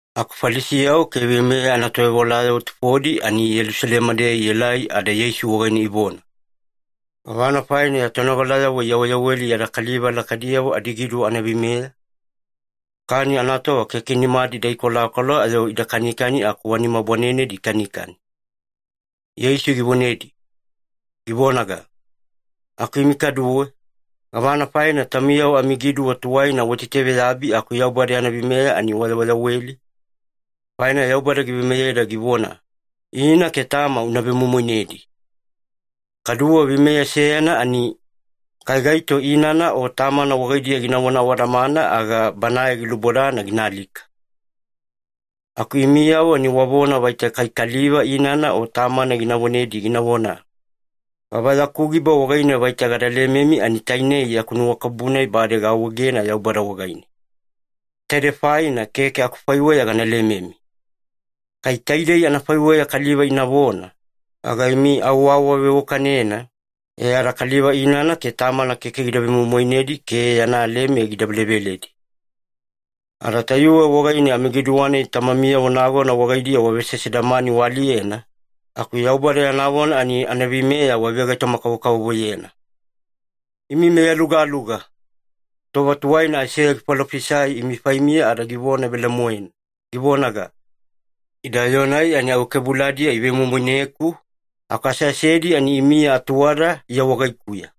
Aku Falisiyavo ke veimeya anatovewalayavo tufodi ani Yelusalema-deya ielai ada Yeisu wagaine ivona, “Gavana faina ya tonogalayavo iyaweyaweli yada kaliva lakaidiyavo adigiduwa anaveimeya? Kani anatova keke nimadi ida kolakola ayo ida kanikani aku wa nima bwanenedi ikanikani.” Yeisu givonedi, givonaga, “Aku imi kaduwe, gavana faina taumiyavo amigiduwa tuwaina waitaitaveyabi aku Yaubada yana veimeya ani wayaweyaweli? Faina Yaubada giveimeyeda givona, ‘Ina ke tama una vemoimoinedi.’ Kaduwe veimeya seyana ani, ‘Kai gaito inana o tamana wagaidiya ginavona awadamana, aga banae gilubodana gina alika.’ Aku imiyavo ani wavona vaita kai kaliva inana o tamana gina vonedi ginavona, ‘Gava yaku giba wagaine vaita gada lememi, ani taine yaku nuwakabubu-nai bade gaawaegena Yaubada wagaine. Taide faina keke akufaiweya gana lememi.’ Kai taidei anafaiweya kaliva inavona, aga imi au waawaveiwakanena, e ada kaliva inana ke tamana keke gida vemoimoinedi ke yana leme gida veleveledi. Ada tayuwe wagaine amigiduwa-nai tamamiyavo nagona wagaidiya wavesesedamani waaliyena, aku Yaubada yana vona ani anaveimeya wavegaitoma-kavokavovoyena. Imi meyalugaluga! Tova tuwaina Aiseya gifalofisai imi faimiya ada givona velemoena, givonaga, ‘Ida yoo-nai ani awakebuladiya ivemoimoineku, aku aseasedi ani imiya atuwada Iya wagaikuya.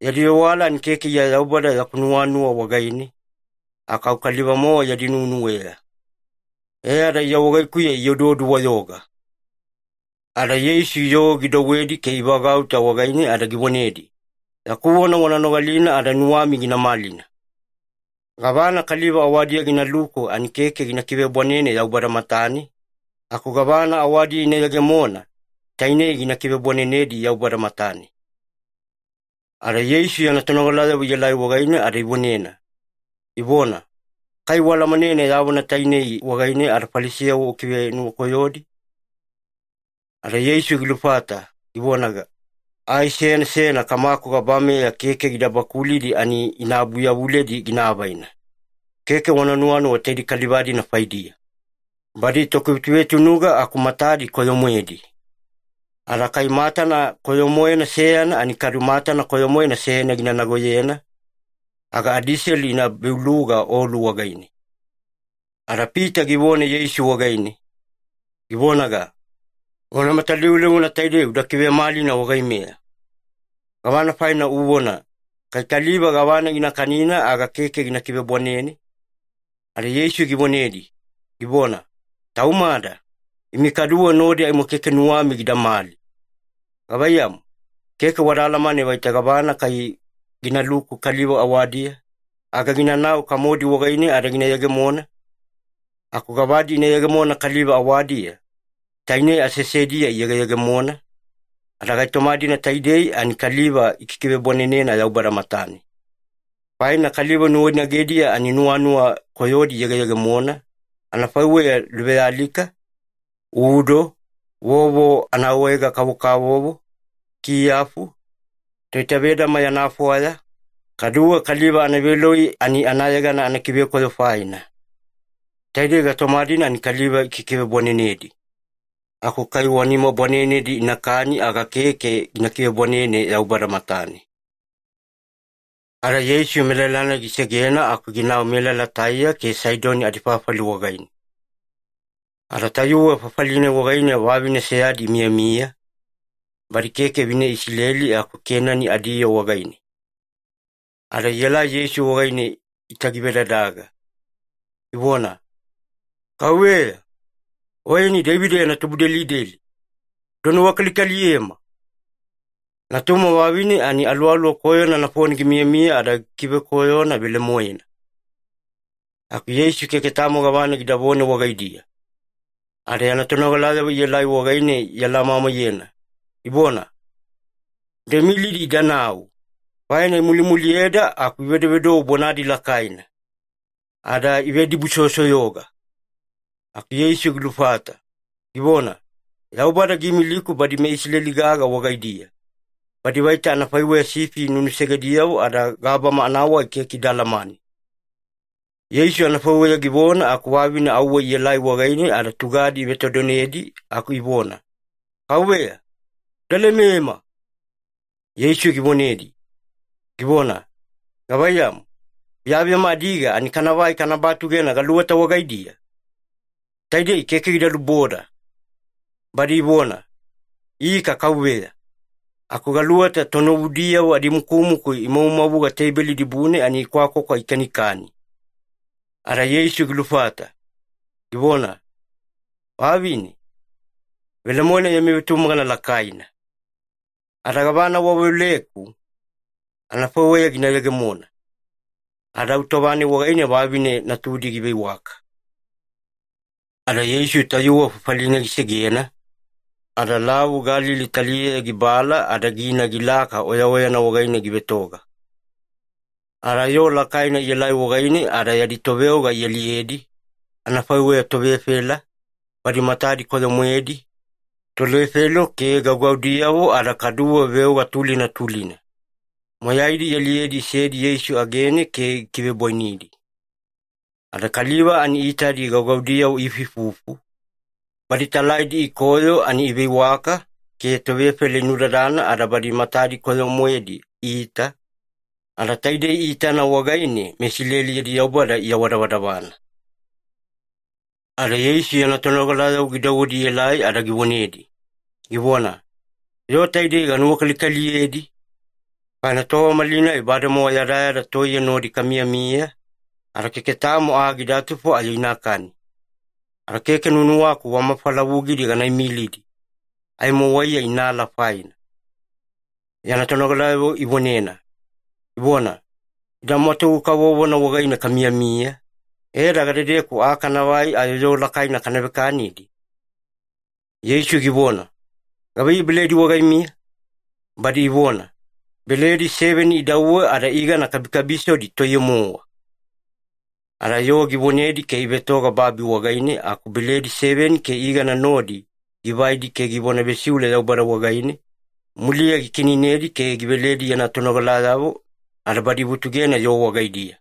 Yadi vewala ani keke Iya Yaubada yaku nuwanuwa wagaine, aku au kaliva-mowa yadi nuwenuweya. E ada Iya wagaikuya ioduodu-wayoga.’” Ada Yeisu yoo gidouwedi ke ivagauta wagaine ada givonedi, “Yaku vona wana nogalina ada nuwami gina malina. Gavana kaliva awadiya ginaluku ani keke gina kivebwanene Yaubada matane, aku gavana awadiya ina yegemona, tainei gina kivebwanenedi Yaubada matane.” Ada Yeisu yana tonogalayavo iela wagaine ada ivonena, ivona, “Kai ualamanena ya vona tainei wagaine ada Falisiyavo ukivenuwakoyodi?” Ada Yeisu gilufata givonaga, “Ai seyana seyana Kamaku gabameya keke gida bakulidi ani ina abuyavuledi gina avaina. Keke wana nuwanuwa taide kaliva-dina faidiya. Badi tokivetuvetunuga aku matadi koyo-moedi. Ada kai matana koyo-moena seyana ani kadu matana koyo-moena seyana gina nagoyena, aga adiselu ina beuluga olu wagaine.” Ada Pita givona Yeisu wagaine, givonaga, “Vona matalivulivuna taidei uda kivemalina wagaimeya. Gavana faina uvona, ‘Kai kaliva gavana gina kanina aga keke gina kivebwanene’?” Ada Yeisu givonedi, givona, “Taumada, imi kaduwe nodi aimo keke nuwami gidamali. Gavaiyamu, keke wada alamane vaita gavana kai ginaluku kaliva awadiya, aga ginanau kamodi wagaine ada gina yegemona? Aku gavadi ina yegemona kaliva awadiya, tainei aseasedi-deya iyegeyegemona, ada gaitoma-dina taidei ani kaliva ikikivebwanenena Yaubada matane. Faina kaliva nuwainagediya-deya ani nuwanuwa koyodi iyegeyegemona, anafaiweya luvealika, udo, vovo anaawaege-kavokavovo, kiyafu, toitavedama yana fwaya, kaduwe kaliva anaveloi ani anayegana anakivekoyo faina. Taidei gaitoma-dina ani kaliva ikikivebwanenedi. Aku kai wa nima bwanenedi inakani aga keke gina kivebwanene Yaubada matane.” Ada Yeisu melala-nai gisegena aku ginau melala Taiya ke Saidoni adifafali wagaine. Ada tayuwe fafali-nai wagaine vavine seyadi imiyamiya, badi keke vine Isileli aku Kenani adiyoo wagaine. Ada ielai Yeisu wagaine itagivedadaga, ivona, “Kauveya, Oyeni Deivida yana tubudelideli, uda nuwakalikaliyema! Natuma vavine ani aluwaluwa koyona nafone gimiyamiya ada gikikivekoyona velemoena.” Aku Yeisu keke tamo gavana gidavona wagaidiya. Ada yana tonogalayavo ielai wagaine ialamamaiyena, ivona, “Uda imilidi idanau, faina imulimuliyeda aku ivedovedou bonadi lakaina.” Ada ivedibusoyosoyoga. Aku Yeisu gilufata, givona, “Yaubada giimiliku badi meIsileli-gaga wagaidiya, badi vaita anafaiweya sifi nunusegediyavo ada gabama anawai keke ida alamane.” Yeisu anafaiweya givona aku vavine auwe ielai wagaine ada tugadi ivetodonedi aku ivona, “Kauveya, uda lemema!” Yeisu givonedi, givona, “Gavaiyamu, biyabiyama adiga ani kanavai kana batugena galuweta wagaidiya? Taidei keke gida luboda.” Badi ivona, “Ika Kauveya. Aku galuweta tunovudiyavo adimukumuku imavumavuga teibeli dibune ani ikwakwakwa ikanikani.” Ada Yeisu gilufata, givona, “Vavine, velemoena yami vetumagana lakaina. Ada gavana waveoleku, anafaiweya gina yegemona.” Ada au tova-nai wagaine vavine natudi giveiwaka. Ada Yeisu tayuwe fafali-nai gisegena, ada Lavu Galili taliyeya gibala ada gina gilaka oyaoyana wagaine givetoga. Ada yoo lakaina ielai wagaine ada yadi toveoga ialiyedi, anafaiweya tovefela, badi matadi koyo-moedi, tolefelo ke gaugaudiyavo ada kaduwe veoga tulina tulina. Moyaidi ialiyedi isedi Yeisu agene ke gikivebwainidi. Ada kaliva ani iitadi gaugaudiyavo iifuifufu, badi talaidi ikoyo ani iveiwaka, ke tovefela inudadana ada badi matadi koyo-moedi iita, ada taidei iitana wagaine meIsileli yadi Yaubada iawadavadavana. Ada Yeisu yana tonogalayavo gidouwedi ielai ada givonedi, givona, “Yoo taidei ganuwakalikaliyedi, faina tova malinai bademowa yadayada toiye nodi kamiyamiya, ada keke tamo aa gidatufo ayo inakani. Ada keke nuwanuwaku wa mafalavugidi gana imilidi, aimo waiya inaala faina.” Yana tonogalayavo ivonena, ivona, “Ida mwatugu kavovona wagaine kamiyamiya, e ada gadedeku aa kanavai ayo yoo lakaina kana vekanidi?” Yeisu givona, “Gavaiyei beledi wagaimiya?” Badi ivona, “Beledi seveni idauwe ada igana kabikabisodi toiye-mowa.” Ada yoo givonedi ke ivetoga babi wagaine aku beledi seveni ke igana nodi givaidi ke givona vesiule Yaubada wagaine, muliya gikiineinedi ke giveledi yana tonogalayavo, ada badi ivutugena yoo wagaidiya.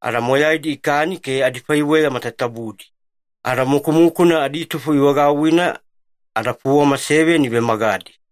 Ada moyaidi ikani ke adifaiweya matatabudi. Ada mukumukuna aditufo ivagauwina, ada fuwama seveni ivemagadi.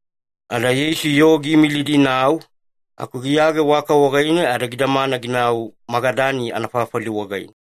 Ada Yeisu yoo giimilidi inau, aku giyage waka wagaine ada gidamana ginau Magadani anafafali wagaine.